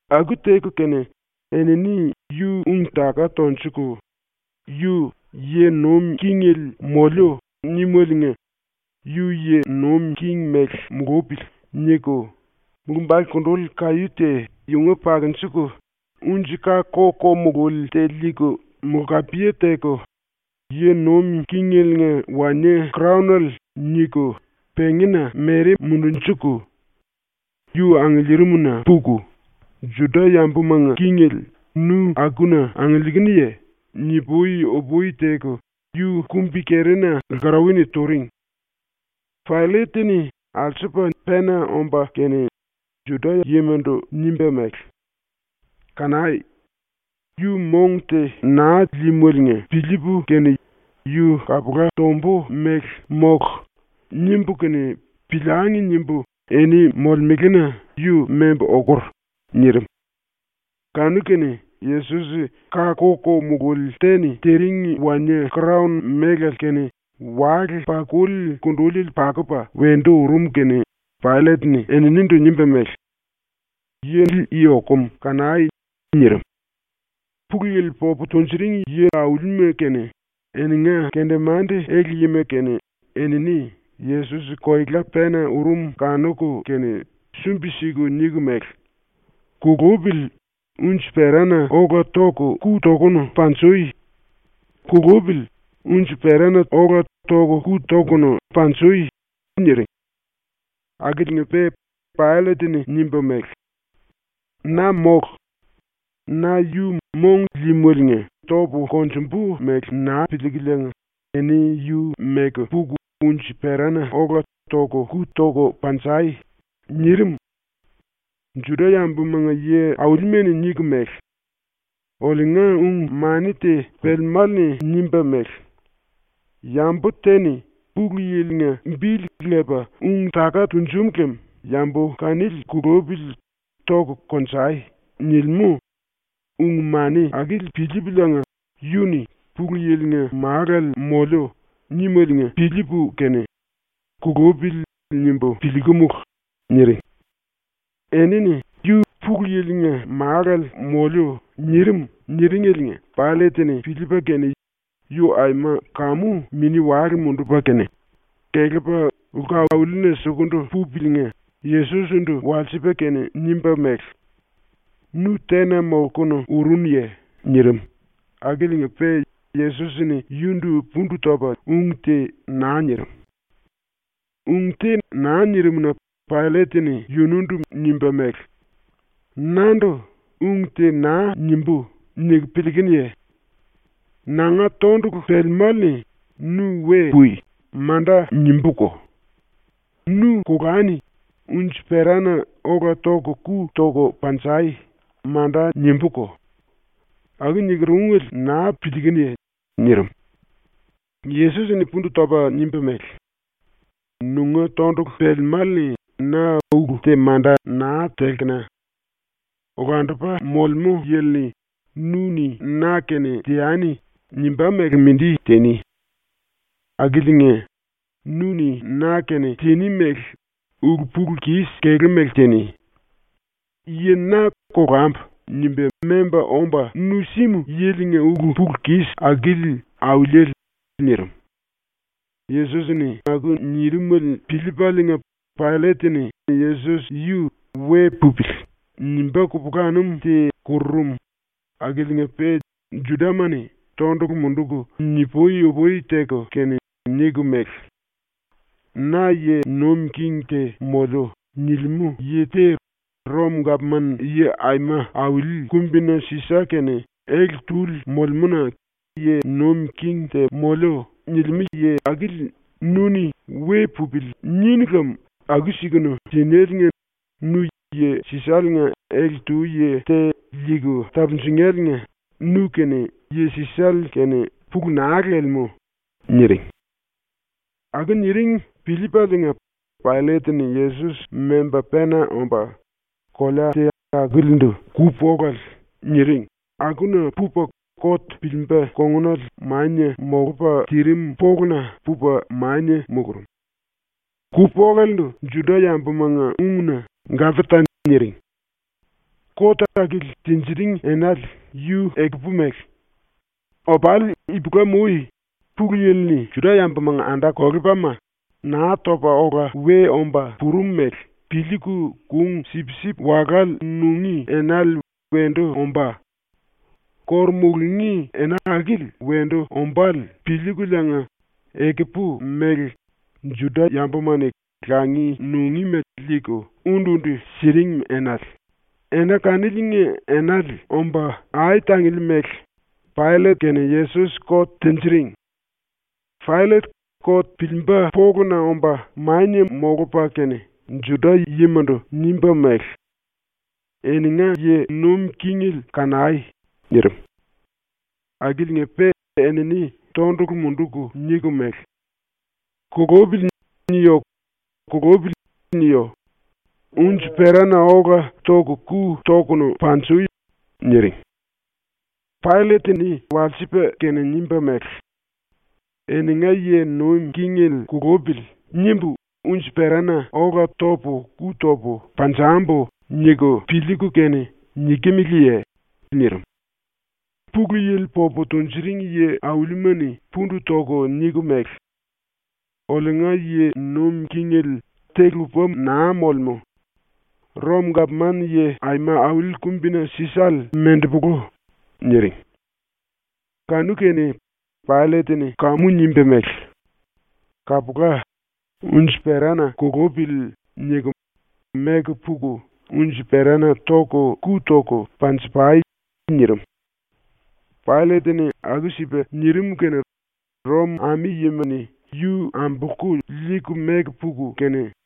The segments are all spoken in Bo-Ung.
Aku teku kene enini yu ung-taka tonjuku ⸤‘Yu “Yi nuim kingele moliu.” nímeliinga yu yi nuim king mele mulupili.’ niku⸥ mulumbale kunduli kaí te yunga pakunjuku, unji-ka ko-ko mululi te liiku mulkapiye teku ‘Yi nuim kingeliinga wanie-kraonele.’ niku pengína mere mundunjuku, yu angiliirimna puku “Juda-yambumanga kingele, nu akuna angiliikunuye?” ni-pui-upui teku, yu kumbi-kerina lkarauwa-ni turing. Paillet-ni alsupa pena omba kene Juda-yimandu nimba mele: “Kanai! ‘Yu mong te naa líímeliinga piliipu kene yu kapula tombu mele mólu.’ nimbu kene ‘Piliangi.’ nimbu eni molemelena yu membu okur.” nirim. Kanu-kene Yesos ka ko-ko mululi te-ni tiring wanie-kraon melale kene wale-pakuli kunduliele pakupa wendu urum kene Paillet-ni eninindu nimba mele: “Yili i okum kanai!” nirim. Pulu Yili popu tunjuring yi-aulima kene eninga kendemande-ele-yima kene enini Yesos koela pena urum kanuku kene sumbi-siku niku mele: “Kulupili, unji-perana ola ⸤toku⸥ ku tokunu panjui! Kulupili, unji-perana ola ⸤toku⸥ ku tokunu panjui!” niring. Akiliinga-pe Paillet-ni nimba mele: “Na mólu. Na yu mong líímeliinga topu konjumbu mele naa piliikereliinga eni yu meku puku unji-perana ola ⸤toku⸥ ku tai!” nirim. Juda-yambumanga yi-aulima-ni niku mele: “Oliunga ung-mani te pelemále-ni nimba mele: ‘Yambu te-ni Pulu Yili-nga bili lepa ung-taka tunjum lem yambu kanili kulupili toku konjai.’ nilimú, ung-mani akili piliipuliinga yu-ni “Pulu Yili-nga Málale moliu.” nímeliinga piliipu kene ‘Kulupili.’ nimbu piliikumulu.” niring. Enini “Yu “Pulu Yili-nga Málale moliu.” nirim.” niringeliinga Paillet-ni piliipa kene yu aima kamu mini-wale mundupa kene, kelepa lku-aulina sukundu pupaliinga Yesos-ndu walsipa kene nimba mele: “Nu tena molkunu urunuye?” nirim, akiliinga-pe Yesos-ni yundu pundu topa ung te naa nirim. Ung te naa nirim-na Paillet-ni yunundu nimba mele: “Nandu ‘Ung te naa nimbú.’ niku piliikunuye? Nanga tondulu pelemále-ni “Nu we pui.” manda nimbúko; “Nu kolani unji-perana ola ⸤toku⸥ ku toko panjai.” manda nimbúko. Aku niker ungele naa piliikunuye?” nirim. Yesos-ni pundu topa nimba mele: “Nunga tondulu pelemále-ni na ulu te manda naa telkena. Olandupa Molemú Yili-ni ‘Nu-ni na-kene teani.’ nimbá mele mindi tiní. Akiliinga, nu-ni na-kene tiní mele ulu-pulu-kis kelú mele tiní. Yi na ‘Kolambu.’ nimba memba omba nu símu yilinga ulu-pulu-kis akili auliele.” nirim. Yesos-ni aku nirimele piliipaliinga Paillet-ni Yesos yu “We pupili.” nimbá kupulanum te kururum, akiliinga-pe Judama-ni tondulu munduku ni-pui-upui teku kene niku mele: “ “Na yi nuim king te moliu.” nilimú yi te Rom-Gapman-Yi Aima Auli Kumbina Sisa-kene ele-túli molemú-na “King te moliu.” nilimú yi akili nu-ni “We pupili.” ninu lem aku-sikunu tinéliinga ⸤nu Yi Sisale-nga ele-tu yi te liiku tapunjunéliinga⸥ nu-kene Yi Sisale-kene pulu naa lelemú.” niring. Aku niring piliipaliinga Paillet-ni Yesos memba pena omba, kolea te akilindu ‘ku-polale’ niring akuna pupa kot piliimba kongunale mania molupa tirim poluna pupa mania mulurum. (Ku-polalendu Juda-yambumanga ungna ‘Gapata’ niring.) Kot akili tinjiring enale yu ekupu mele. Opali ipulam-ui Pulu Yili-ni Juda-yambumanga anda-kolepalima Naa Topa Ola We Omba Purum mele piliiku kung sipsip-walále nungí enale wendu ombá. ⸤Kóru mulungí ena akili⸥ wendu ombále piliikuliinga ekupu mele Juda-yambuma-ni langi nungíma liiku undu-undu siring enale, ena kaniliinga enale omba ai-tangili mele, Paillet-kene Yesos kot tinjiring. Paillet kot piliimba poluna omba mania molupa kene, Juda-yimandu nimba mele: “Eninga yi nuim kingele kanai!” nirim. Akiliinga-pe enini tondulu munduku niku mele: “ “Kulupili.” niyo! “Kulupili.” niyo! Unji-perana ola ⸤toku⸥ ku tokunu panjui!” niring. Paillet-ni walsipa kene nimba mele: “‘ ‘Eninga yi nuim kingele kulupili.’ nimbu unji-perana ola ⸤topu⸥ ku topu panjambu.’ niku piliiku kene nikimeleye?” nirim. Pulu Yili popu tunjuring yi-aulima-ni pundu toku niku mele: “Oliunga yi nuim kingele te-lupa naa molemú. Rom-Gapman-Yi Aima Auli Kumbina Sisale mendepolu.” niring. Kanu-kene Paillet-ni kamu nimba mele: “Kapula, ‘Unji-perana kulupili.’ niku meku puku unji-perana ⸤toku⸥ ku toku panji-pai.” nirim. Paillet-ni aku-sipa nirim kene Rom ami-yima-ni yu ambolku liiku meku puku kene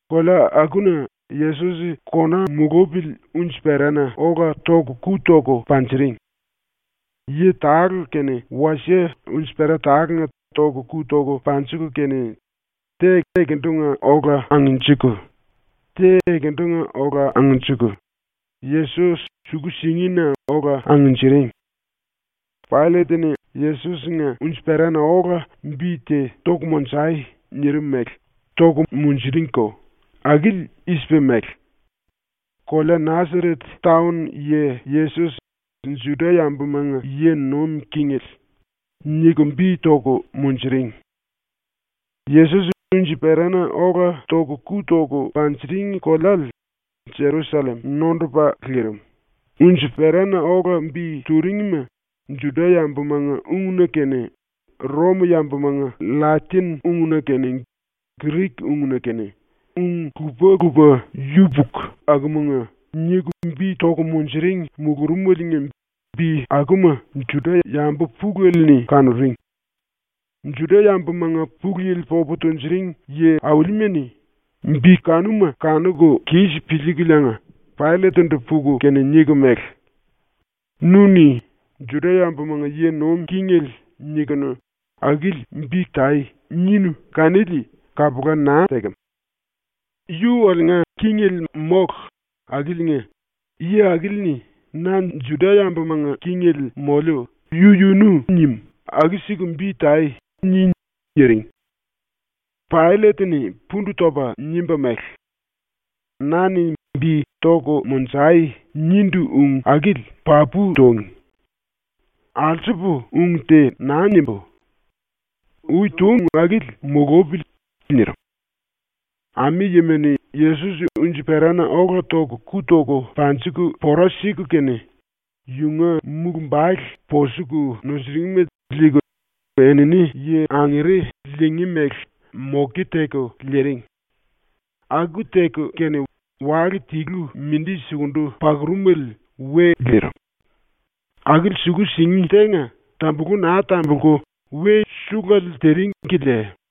Kolea akuna Yesos ⸤kona mulupili⸥ unji-perana ola ⸤toku⸥ ku toku panjiring. Yi tale-kene wasie unji-pera tálenga ⸤toku⸥ ku toku panjiku kene, te ekendunga ola angnjiku, te ekendunga ola angnjiku, Yesos suku-singina ola angnjiring. Paillet-ni “Yesos-nga unji-perana ola bi te toku monjai.” nirim mele toku munjuringko. Akili i-sipa mele: KOLEA NASARET TAON YI YESOS, JUDA-YAMBUMANGA YI NUIM KINGELE niku bi toku munjuring. Yesos unji-perana ola ⸤toku⸥ ku toku panjiring koleale Jerusallem nondupa lirim, unji-perana ola bi turingima Juda-yambumanga ungna kene ⸤Rom-yambumanga⸥ LLatin-ungna kene Grik-ungna kene, ung lupa-lupa yupuku akumanga niku bi toku munjuring mulurumeliinga bi akuma Juda-yambu pulele-ni kanuring. Juda-yambumanga Pulu Yili popu tunjuring yi-aulima-ni bi kanuma kanuku kis piliikuliinga Paillet-ndu puku kene niku mele: “Nu-ni “Judamanga yi nuim kingele” nikunu “Akili bi tai.” ninu kanili kapula naa tekem. ⸤Yu oliunga kingele mólu akiliinga⸥ ‘Yi akili-ni “Na Judamanga kingele moliu.” yu-yunu nim.’ “Aku-siku bi tai.” ni.” niring. Paillet-ni pundu topa nimba mele: “Na-ni bi “Toku monjai.” nindu ung akili papu túngi. Alsupu ung te naa nimbú. Ui túngi ung akili mulupili.” nirim. Ami-yima-ni Yesos unji-perana ola ⸤toku⸥ ku toku panjiku pora siku kene, yunga mulumbale ⸤posuku nusuringma⸥ liiku, enini yi angere liingí mele moke teku liiring. Aku teku kene wale tilu mindi sukundu pakurumele we lirim. Akili suku-singi tenga tambulu naa tambulku we suluele tiring kilia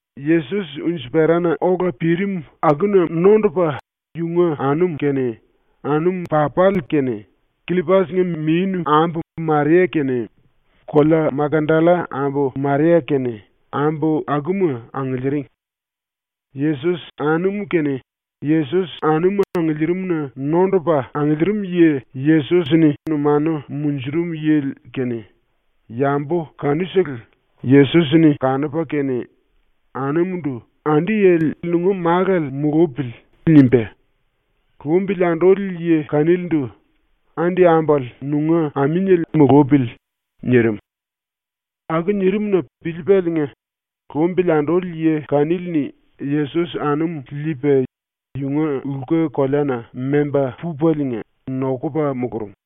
Yesos unji-perana ola pirim akuna nondupa yunga anum kene, anum-papale kene, Killopas-nga minu-ambu Maria kene, kolea Makdalla ambu Maria kene, ambu akuma angiliiring. ⸤Yesos-⸥ anum kene, ⸤Yesos-anum angiliirimna⸥ nondupa angiliirim yi Yesos numanu munjurum yili kene, ⸤yambu kanusele⸥ Yesos-ni kanupa kene anumundu “Andi yili nunga málale mulupili.” nimba, lumbili anduli yi kanilindu “Andi ambale nunga aminiele mulupili.” nirim. Aku nirim-na piliipaliinga lumbili anduli ⸤yi⸥ kanili-ni Yesos-anum liipa yunga lku koleana memba pupaliinga nokupa mulurum.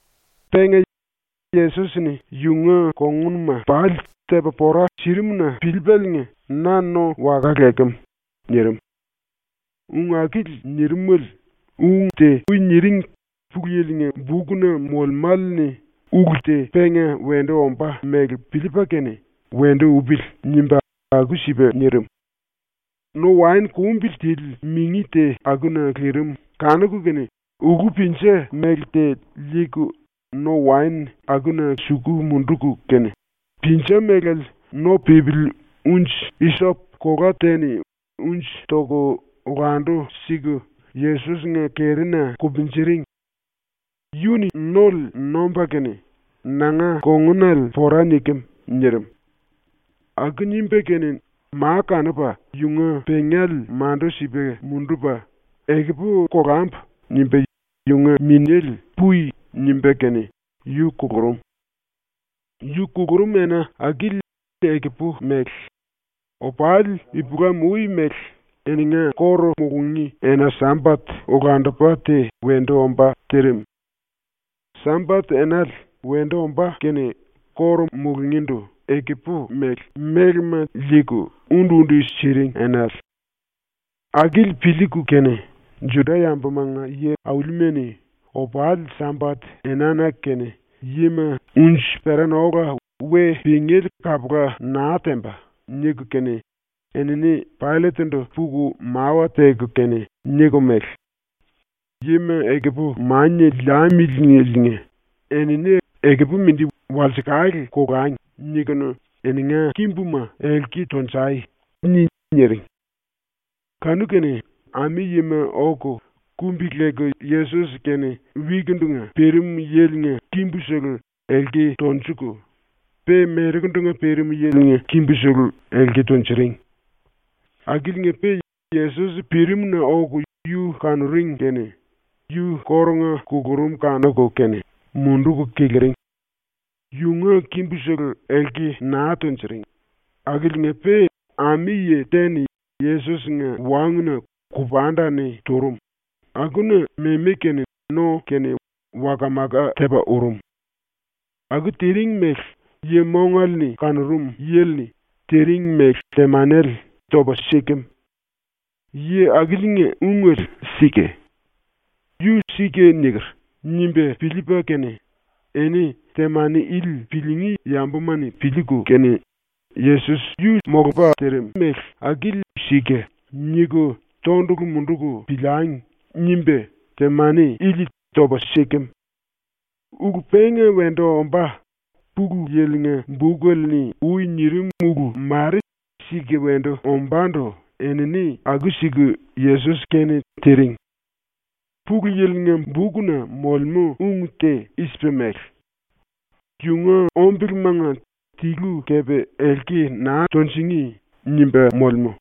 Penga, Yesos-ni yunga kongunuma pali tepa pora sirimu-na piliipaliinga, “Na no waka lekem.” nirim. Ung akili nirimele ung te ui niring Pulu Yili-nga bukna molemále-ni ulu te penga wendu ombá mele piliipa kene ‘Wendu upili.’ nimba aku-sipa nirim. No-waen kumbili tili mingi te akuna lirim kanuku kene ulú-pinja mele te liiku no-waen akuna suku munduku kene, pinja melale no pípili unji-isop kolá te-ni unji toku olandu-siku Yesos-nga kerina kupunjiring. Yu-ni nole nomba kene “Nanga kongunale pora nikem.” nirim. Aku nimba kene ma kanupa yunga pengale mandu-sipa mundupa ‘Ekupu kolambu.’ nimba yunga minéle “Pui.” nimba kene yu kulurum. Yu kulurum ena akili ekupu mele, opali ipulam-ui mele eninga kóru mulungí ena-Sambat olandupa te wendu ombá tirim. Sambat-enale wendu ombá kene kóru mulungíndu ekupu mele, mélema liiku undu-undu siring enale. Akili piliiku kene Juda-yambumanga yi-aulima-ni ‘Opali Sambat-enana kene yima unji-perana ola we pingéle kapula naa temba.’ niku kene enini Paillet-ndu puku mawa teku kene niku mele: “Yima ekupu mania liamilieliinga ⸤‘Enini ekupu mindi walsekale kolangi.’⸥ niku “Eninga kimbuma elki tonjai.” ni.” niring. Kanu-kene ami-yima oku kumbi-leku Yesos-kene wikindunga pirim yilinga kimbusele elki tonjuku, pe merekundunga pirim yilinga kimbusele elki tunjuring. Akiliinga-pe Yesos pirimna oku yu kanuring kene yu kórunga kulurum kanuku kene munduku kiliring. Yunga kimbusele elki naa tunjuring akiliinga-pe ami-yi te-ni Yesos-nga wanguna kupanda-ni turum, akuna memi kene no kene waka-maka tepa urum. Aku tiring mele yi mongale-ni kanurum yili-ni tiring mele temanele topa sirim. Yi akiliinga ungele sika. Yu ‘Sika niker.’ nimba piliipa kene ‘Eni temani ili piliingí yambuma-ni piliiku kene ‘Yesos yu sika’ niku tondulu munduku piliangi.’ nimba temani ili topa silimú. Ulu penga wendu ombá Pulu Yili-nga bukele-ni ui nirim ulu mare sika wendu ombándu enini aku-siku Yesos-kene tiring. Pulu Yili-nga bukna molemú ung te i-sipa mele: ‘Yunga ombelemanga tilu kepe elki naa tunjingí.’ nimba molemú.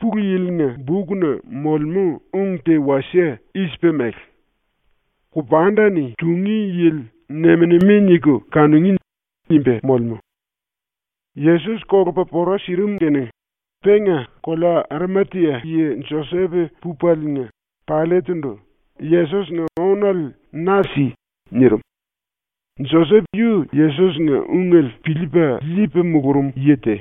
Pulu Yili-nga bukna molemú ung te wasie i-sipa mele: ‘Kupanda-ni tungí yili nem-nemi niku kanungí.’ nimba molemú. Yesos kolupa pora sirim kene penga kolea Arimatia yi Josep pupaliinga Paillet-ndu “Yesos-nga ónale na si.” nirim. Josep yu Yesos-nga ungele piliipa liipa mulurum yi te,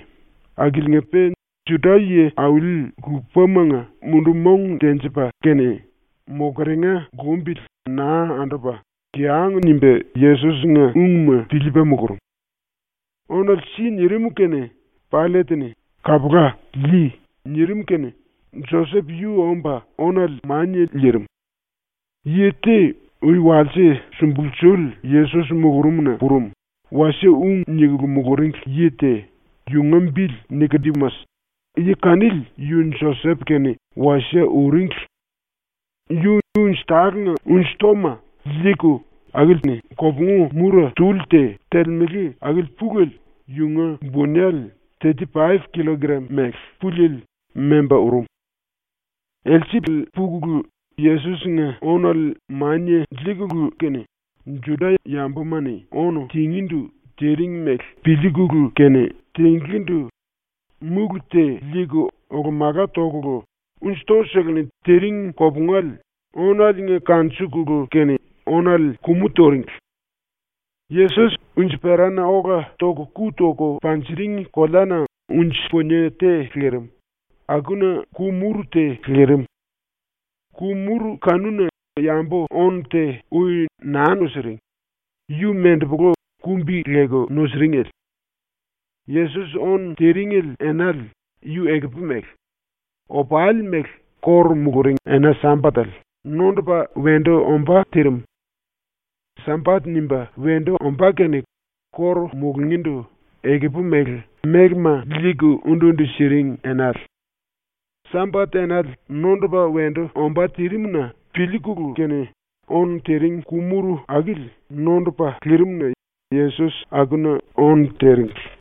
akiliinga-pe Juda ⸤yi-auli lupa⸥manga mundu-mong tenjipa kene mokeringa lumbili naa andupa kiyang nimba Yesos-nga ungma piliipa mulurum. “Ónale si.” nirim kene Paillet-ni “Kapula, lii.” nirim kene Josep yu omba ónale mania liirim. Yi te, ui walse sumbulsuli Yesos mulurumna purum, wasie ung nikulu muluringli yi te, yunga bili Nikodimas, yi kanili yu Josep-kene wasie uringli. Yu unji-tálenga unji-toma liiku akili-ni kopungu mura tuli te telemele akili pulele, yunga bunele teti paip killokram mele puliele, memba urum. Elsele pukulu Yesos-nga ónale mania liikulu kene, ⸤Juda-yambuma-ni ónu tingíndu tiring mele piliikulu kene tinglíndu⸥ múlu te liiku olo-mala tokulu, unji-to-seleni tiring kopungale ónaliinga kanjikulu kene ónale kumu turingli. Yesos unji-perana ola ⸤toku⸥ ku toku panjiring koleana unji-punie te lirim, akuna ku-muru te lirim. Ku-muru kanuna yambu-ónu te ui naa nusiring, yu mendepolu kumbi-leku nusiringli. Yesos ónu tiringli enale yu ekupu mele, opali mele ⸤kóru muluring⸥ ena-Sambatele nondupa wendu ombá tirim. Sambat nimba wendu ombá kene kóru mulungíndu ekupu mele, mélema liiku undu-undu siring enale. Sambat-enale nondupa wendu ombá tirim-na piliikulu kene ónu tiring ku-muru akili nondupa lirim-na Yesos akuna ónu tiringli.